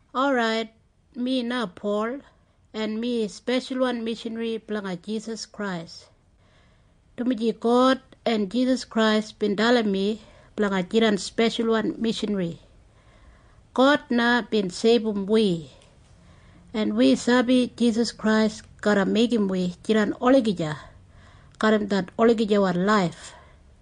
Orait, mi na Pol, en mi speshalwan mishanri blanga Jisas Krais, dumaji God en Jisas Krais bin dalim mi blanga jidan speshalwan mishanri. God na bin seibum wi, en wi sabi Jisas Krais garra meigim wi jidan olagija garram det olagijawan laif.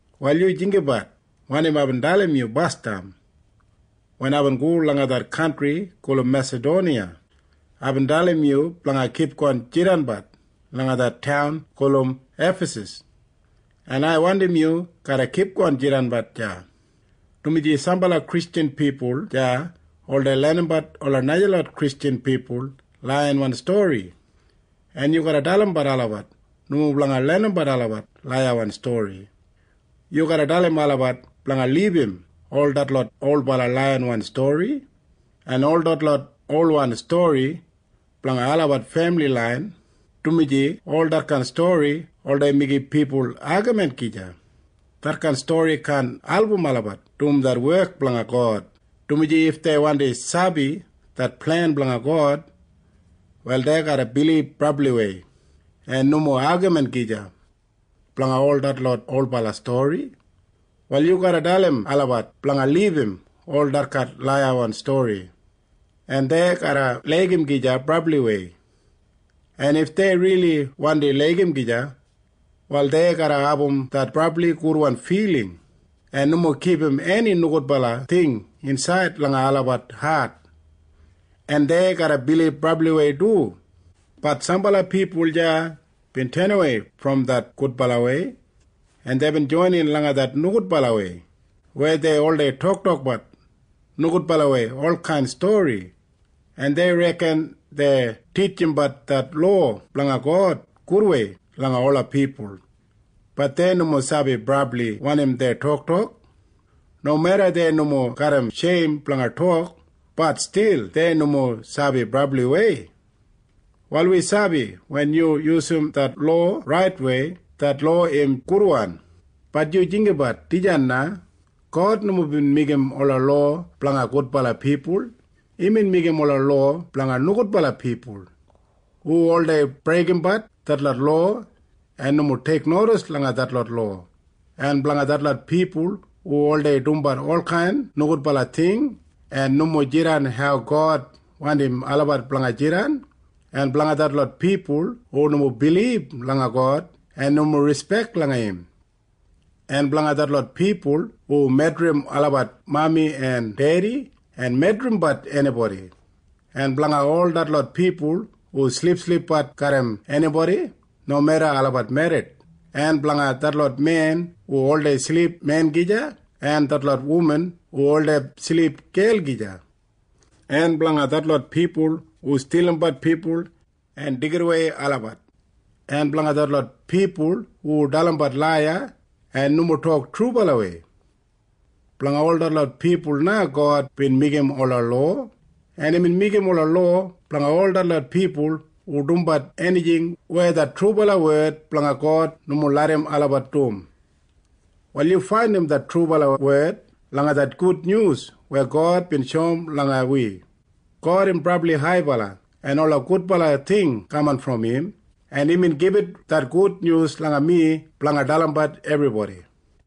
Wal yu jinggabat wanim aibin dalim yu basdam. Wen aibin go langa det kantri gulum Mesadoniya, aibin dalim yu blanga kipgon jidanbat langa det taun gulum Efasas, en ai wandim yu garra kipgon jidanbat deya, dumaji sambala Kristjan pipul deya oldei lenimbat ola najalot Kristjan pipul laiyawan stori, en yu garra dalim olabat nomo blanga lenimbat olabat laiyawan stori. Yu garra dalim olabat blanga libum ol detlot olbala laiyawan stori en ol detlot olwan stori blanga olabat femili lain, dumaji ol detkain stori oldei meigim pipul agamin gija. Detkain stori kaan album olabat dum det wek blanga God, dumaji if dei wandi sabi det plen blanga God, wal dei garra bilib brabliwei en nomo agamin gija blanga ol detlot olbala stori. Wal yu garra dalim olabat blanga libum ol detkain laiyawan stori, en dei garra laigim gija brabliwei. En if dei rili wandi laigim gija, wal dei garra abum det brabli gudwan filing en nomo kipum eni nogudbala ting insaid langa olabat hat. En dei garra bilib brabliwei du. Bat sambala pipul deya bin tenawei brom det gudbalawei, en deibin joinin langa det nogudbalawei weya dei oldei toktokbat nogudbalawei olkain stori, en dei reken dei titjimbat det lowa blanga God gudwei langa ola pipul. Bat dei nomo sabi brabli wanim dei toktok. Nomeda dei nomo garram sheim blanga tok, bat stil dei nomo sabi brabliwei. Wal wi sabi wen yu yusum det lowa raitwei, det lowa im gudwan. Bat yu jinggabat dijan na. God nomo bin meigim ola lowa blanga gudbala pipul. Imbin meigim ola lowa blanga nogudbala pipul, hu oldei breigimbat detlot lowa en nomo teiknodis langa detlot lowa, en blanga detlot pipul hu oldei dumbat olkain nogudbala ting en nomo jidan hau God wandim olabat blanga jidan, en blanga detlot pipul hu nomo bilib langa God en nomo rispek langa im, en blanga detlot pipul hu medrim olabat mami en dedi en medrimbat enibodi, en blanga ol detlot pipul hu silipsilipbat garram enibodi nomeda olabat merrit, en blanga detlot men hu oldei silip men gija en detlot wuman hu oldei silip gel gija, en blanga detlot pipul hu stilimbat pipul en deigidawei olabat, en blanga detlot pipul hu dalimbat laiya en nomo tok trubalawei. Blanga ol detlot pipul na God bin meigim ola lowa. En imbin meigim ola lowa blanga ol detlot pipul hu dumbat enijing weya det trubala wed blanga God nomo larram olabat dum. Wal yu faindim det trubala wed langa det gudnyus weya God bin shoum langa wi. God im brabli haibala, en ola gudbala ting kaman brom im, en imbin gibit det gudnyus langa mi blanga dalimbat ebribodi.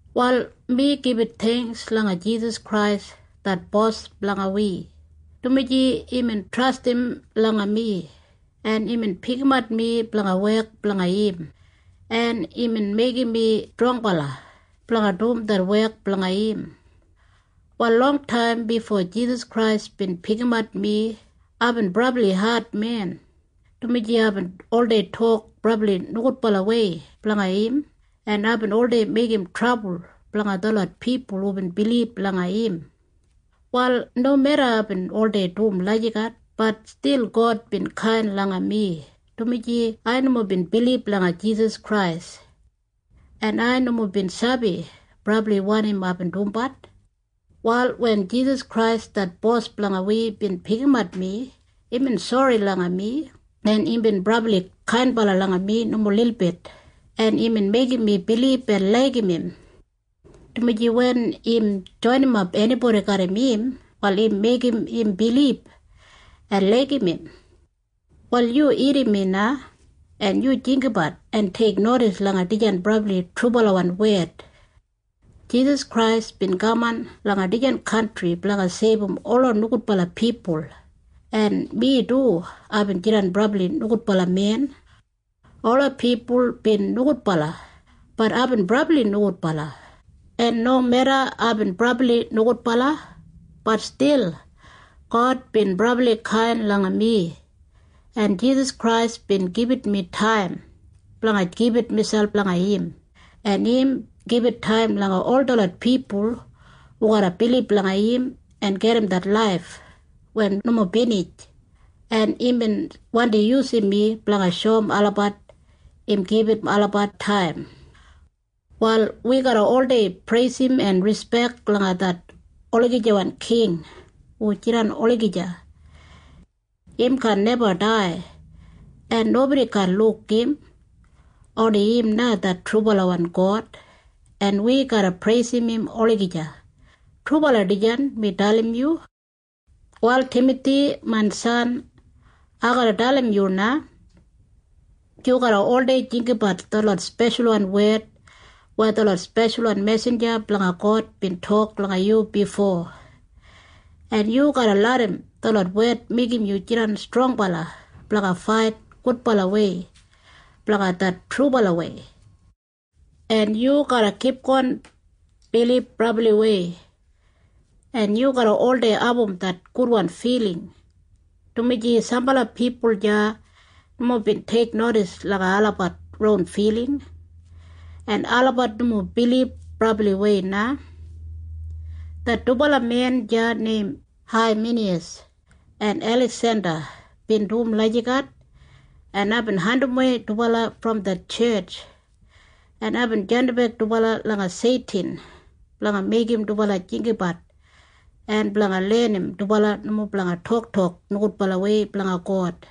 Wal mi gibit theingks langa Jisas Krais det Bos blanga wi, dumaji imbin trastim langa mi, en imbin pikimat mi blanga wek blanga im, en imbin meigim mi strongbala blanga dum det wek blanga im. Wal longtaim bifo Jisas Krais bin pikimat mi, aibin brabli admen, dumaji aibin oldei tok brabli nogudbalawei blanga im, en aibin oldei meigim trabul blanga detlot pipul hubin bilib langa im. Wal nomeda aibin oldei dum lagijat, bat stil God bin kain langa mi, dumaji ai nomo bin bilib langa Jisas Krais, en ai nomo bin sabi brabli wanim aibin dumbat. Wal wen Jisas Krais det Bos blanga wi bin pikimat mi, imbin sori langa mi, en imbin brabli kainbala langa mi nomo lilbit, en imbin meigim mi bilib en laigim im, dumaji wen im joinimap enibodi garram im, wal im meigim im bilib en laigim im. Wal yu irrim mi na, en yu jinggabat en teiknodis langa dijan brabli trubalawan wed. Jisas Krais bin kaman langa dijan kantri blanga seibum ola nogudbala pipul, en mi du aibin jidan brabli nogudbala men. Ola pipul bin nogudbala. Bat aibin brabli nogudbala. En nomeda aibin brabli nogudbala, bat stil God bin brabli kain langa mi, en Jisas Krais bin gibit mi taim blanga gibit miselp langa im, en im gibit taim langa ol detlot pipul hu garra bilib langa im en gedim det laif weya nomo binij, en imbin wandi yusum mi blanga shoum olabat im gibit olabat taim. Wal wi garra oldei preisim en rispek langa det olagijawan king hu jidan olagija. Im kaan neba dai, en nobodi kaan luk im. Oni im na det trubalawan God, en wi garra preisim im olagija. Trubala dijan mi dalim yu. Wal Timathi main san, ai garra dalim yu na. Yu garra oldei jinggabat detlot speshalwan wed weya detlot speshalwan mesinja blanga God bin tok blanga yu bifo, en yu garra larram detlot wed meigim yu jidan strongbala blanga fait gudbalawei blanga det trubalawei, en yu garra kipgon bilib brabliwei, en yu garra oldei abum det gudwan filing, dumaji sambala pipul deya nomo bin teiknodis langa olabat ron filing, en olabat nomo bilib brabliwei na. Det dubala men deya neim Haiminiyas en Eliksenda bin dum lagijat, en aibin andimwei dubala brom det tjetj, en aibin jandimbek dubala langa Seitin blanga meigim dubala jinggabat en blanga lenim dubala nomo blanga toktok nogudbalawei blanga God.